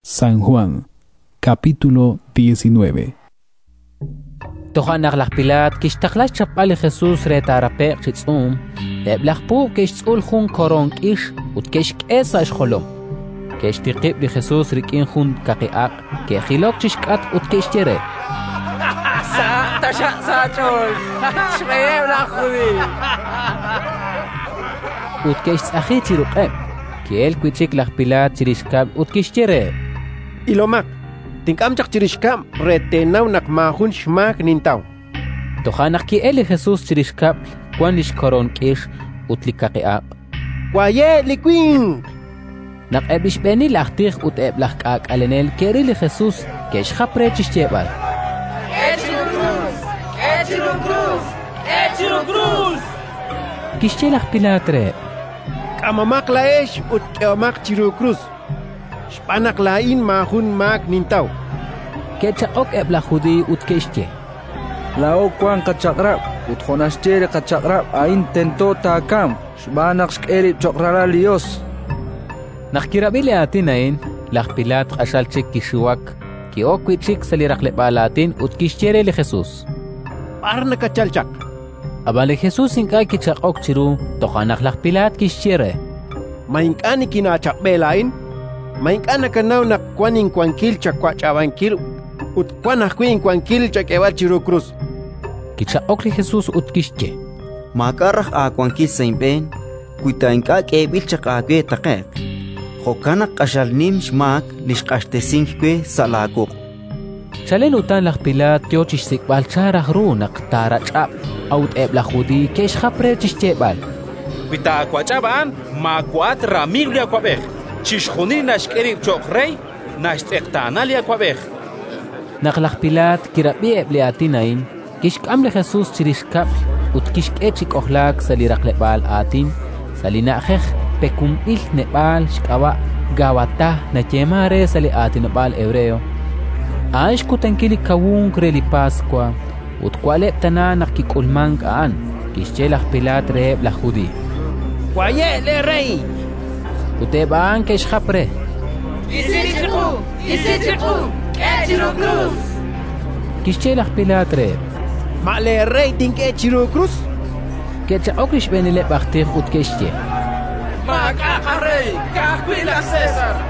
Waye' li winq! Toja' naq laj Pilaat kixtaqla xchapb'al li Jesus re taarape'q chi tz'uum. Eb' laj puub' ke'xtz'ul jun li koroon k'ix ut ke'xk'e sa' xjolom. Ke'xtiqib' li Jesus rik'in jun kaqi aq', ke'jilok chi xk'atq ut ke'xye re: —Sahaq taxaq sa' aach'ool, at xreyeb' laj Judiiy! Ut ke'xtz'aji chi ruq'eb'. Ki'elk wi' chik laj Pilaat chirix kab'l ut kixye reheb': —Ilomaq, tink'am chaq chirix kab'l re teenaw naq maajun xmaak nintaw. Toja' naq ki'elk li Jesus chirix kab'l, wank li xkoroon k'ix ut li xkaqi aq'. —Waye' li winq! chan laj Pilaat reheb'. Naq eb' li xb'eenil aj tij ut eb' laj k'aak'alenel ke'ril li Jesus, ke'xjap re chi xyeeb'al: —K'e chiru krus, k'e chiru krus! Kixye laj Pilaat reheb': —K'amomaq laa'ex ut k'ehomaq chiru krus, xb'aan naq laa'in maajun xmaak nintaw. Ke'chaq'ok eb' laj Judiiy ut ke'xye: —Laa'o wank qaChaq'rab' ut jo' naxye li Chaq'rab' a'in, tento taakamq xb'aan naq xk'e rib' cho'q Ralal li Yos. Naq kirab'i li aatin a'in, laj Pilaat q'axal chik kixiwak. Ki'ok wi' chik sa' li raqleb'aal aatin ut kixye re li Jesus: —B'ar nakatchalk chaq? Ab'an li Jesus ink'a' kichaq'ok chiru. Toja' naq laj Pilaat kixye re: —Ma ink'a' nikinaachaq'b'e laa'in? Ma ink'a' nakanaw naq wank inwankil chawach'ab'ankil ut wank ajwi' inwankil chak'eeb'al chiru krus? Kichaq'ok li Jesus ut kixye: —Maak'a' raj aawankil sa' inb'een, wi ta ink'a' k'eeb'il chaq aawe taqe'q; jo'kan naq q'axal nim xmaak li xq'axtesink we sa' laawuq'. Chalen utan laj Pilaat yo chi xsik'b'al chan raj ru naq taarach'ab'. A'ut eb' laj Judiiy ke'xjap re chi xyeeb'al: —Wi taawach'ab' a'an, maawa'at ramiiw li awab'ej. Chixjunil li naxk'e rib' cho'q rey, naxtz'eqtaana li awab'ej. Naq laj Pilaat kirab'i eb' li aatin a'in, kixk'am li Jesus chirix kab'l ut kixk'e chi k'ojlaak sa' li raqleb'aal aatin, sa' li na'ajej “Pekunb'il Neb'aal” xk'ab'a', Gabatá nayeemank re sa' aatinob'aal hebreo. A'an xkutankil li Kawunk re li Paswa, ut wa'leb' tana naq kik'ulmank a'an. Kixye laj Pilaat reheb' laj Judiiy: —Waye' leerey! Ut eb' a'an ke'xjap re: —Isi chiqu, isi chiqu! K'e chiru krus! chankeb'. Kixye laj Pilaat reheb': —Ma a' leerey tink'e chiru krus? Ke'chaq'ok li xb'eenileb' aj tij ut ke'xye: —Maak'a' qarey, ka'ajwi' laj César.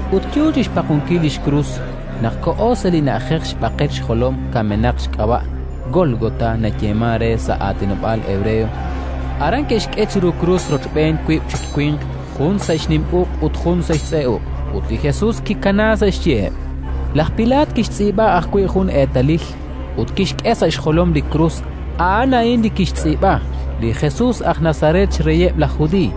ut yo chi xpaqonkil li xkrus naq koho sa' li na'ajej xB'aqel-xjolom-kamenaq xk'ab'a' (Gólgota nayeemank re sa' aatinob'aal hebreo). Aran ke'xk'e chiru krus rochb'een wiib' chik winq, jun sa' xnim uq' ut jun sa' xtz'e uq'; ut li Jesus kikanaak sa' xyiheb'. Laj Pilaat kixtz'iib'a ajwi' jun eetalil ut kixk'e sa' xjolom li krus. A'an a'in li kixtz'iib'a: “Li Jesus aj Nazaret, xReyeb' laj Judiiy”.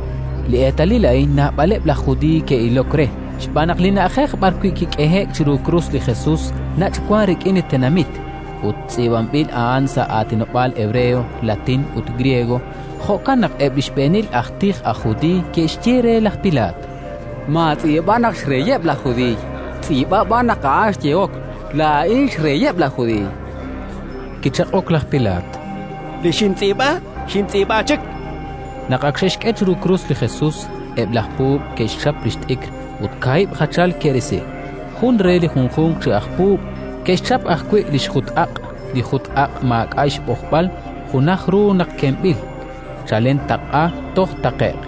Li eetalil a'in naab'aleb' laj Judiiy ke'ilok re, xb'aan naq li na'ajej b'arwi' kik'ehe'k chiru krus li Jesus nach' wank rik'in li tenamit; ut tz'iib'anb'il a'an sa' aatinob'aal hebreo, latín ut griego. Jo'kan naq eb' li xb'eenil aj tij aj Judiiy ke'xye re laj Pilaat: —Maatz'iib'a naq «xReyeb' laj Judiiy»; tz'iib'a b'an naq a'an xyehok: «Laa'in xReyeb' laj Judiiy». Kichaq'ok laj Pilaat: —Li xintz'iib'a, xintz'iib'a chik, chan. Naq ak xe'xk'e chiru krus li Jesus, eb' laj puub' ke'xchap li xt'ikr ut kaahib' jachal ke'risi: jun re li junjunq chi aj puub'. Ke'xchap ajwi' li xjut-aq'. Li jut-aq' maak'a' xb'ojb'al, junaj ru naq kemb'il chalen taq'a toj taqe'q.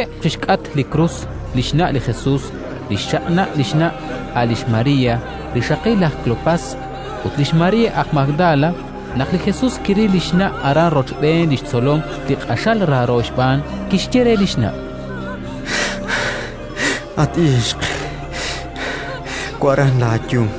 Xaqxookeb' chi xk'atq li krus li xna' li Jesus, li xchaq'na' li xna', a' lix María, rixaqil laj Kleopás, ut lix María aj Magdala. Naq li Jesus kiril li xna' aran rochb'een li xtzolom li q'axal raaro xb'aan, kixye re li xna': —At ixq, wa'ran laayum.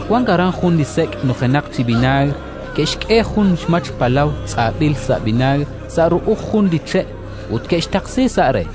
Wank aran jun li sek' nujenaq chi vinaagr. Ke'xk'e jun xmach palaw tz'ab'il sa' vinaagr sa' ru'uj jun li che', ut ke'xtaqsi sa' re.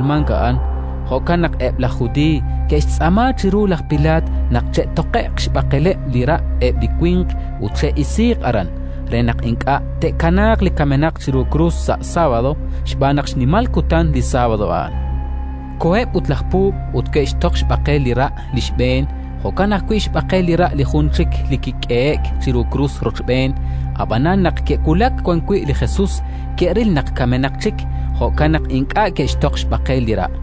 Yo li Kawunk re li Paswa naq kik'ulmank a'an; jo'kan naq eb' laj Judiiy ke'xtz'aama chiru laj Pilaat naq che'toqe'q xb'aqeleb' li ra' eb' li winq ut che'isiiq aran, re naq ink'a' te'kanaaq li kamenaq chiru krus sa' sábado, xb'aan naq xnimal kutan li sábado a'an. Koheb' ut laj puub' ut ke'xtoq xb'aqel li ra' li xb'een, jo'kan ajwi' xb'aqel li ra' li jun chik li kik'ehe'k chiru krus rochb'een. Ab'anan, naq ke'wulak wan wi' li Jesus, ke'ril naq kamenaq chik; jo'kan naq ink'a' ke'xtoq xb'aqel li ra'.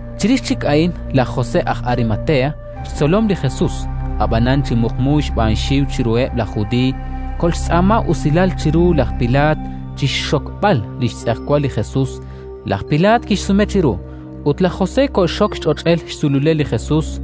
Chirix chik a'in laj José aj Arimatea, xtzolom li Jesus (ab'anan chi muqmu xb'aan xxiw chiruheb' laj Judiiy), koxtz'aama usilal chiru laj Pilaat chi xxokb'al li xtz'ejwal li Jesus. Laj Pilaat kixsume chiru, ut laj José koxxok li xch'och'el xsululel li Jesus.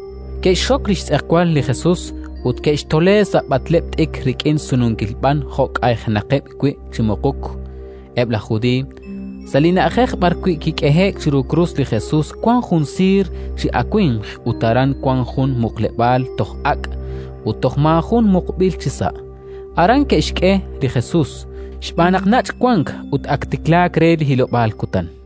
Ke'xxok li xtz'ejwal li Jesus ut ke'xtole sa' b'atleb' t'ikr rik'in sununkil b'an jo' k'aynaqeb' wi' chi muquk eb' laj Judiiy. Sa' li na'ajej b'arwi' kik'ehe'k chiru krus li Jesus wank jun siir chi awimq ut aran wank jun muqleb'aal toj ak', ut toj maajun muqb'il chisa'. Aran ke'xk'e li Jesus, xb'aan naq nach' wank ut ak tiklaak re li hilob'aal kutan.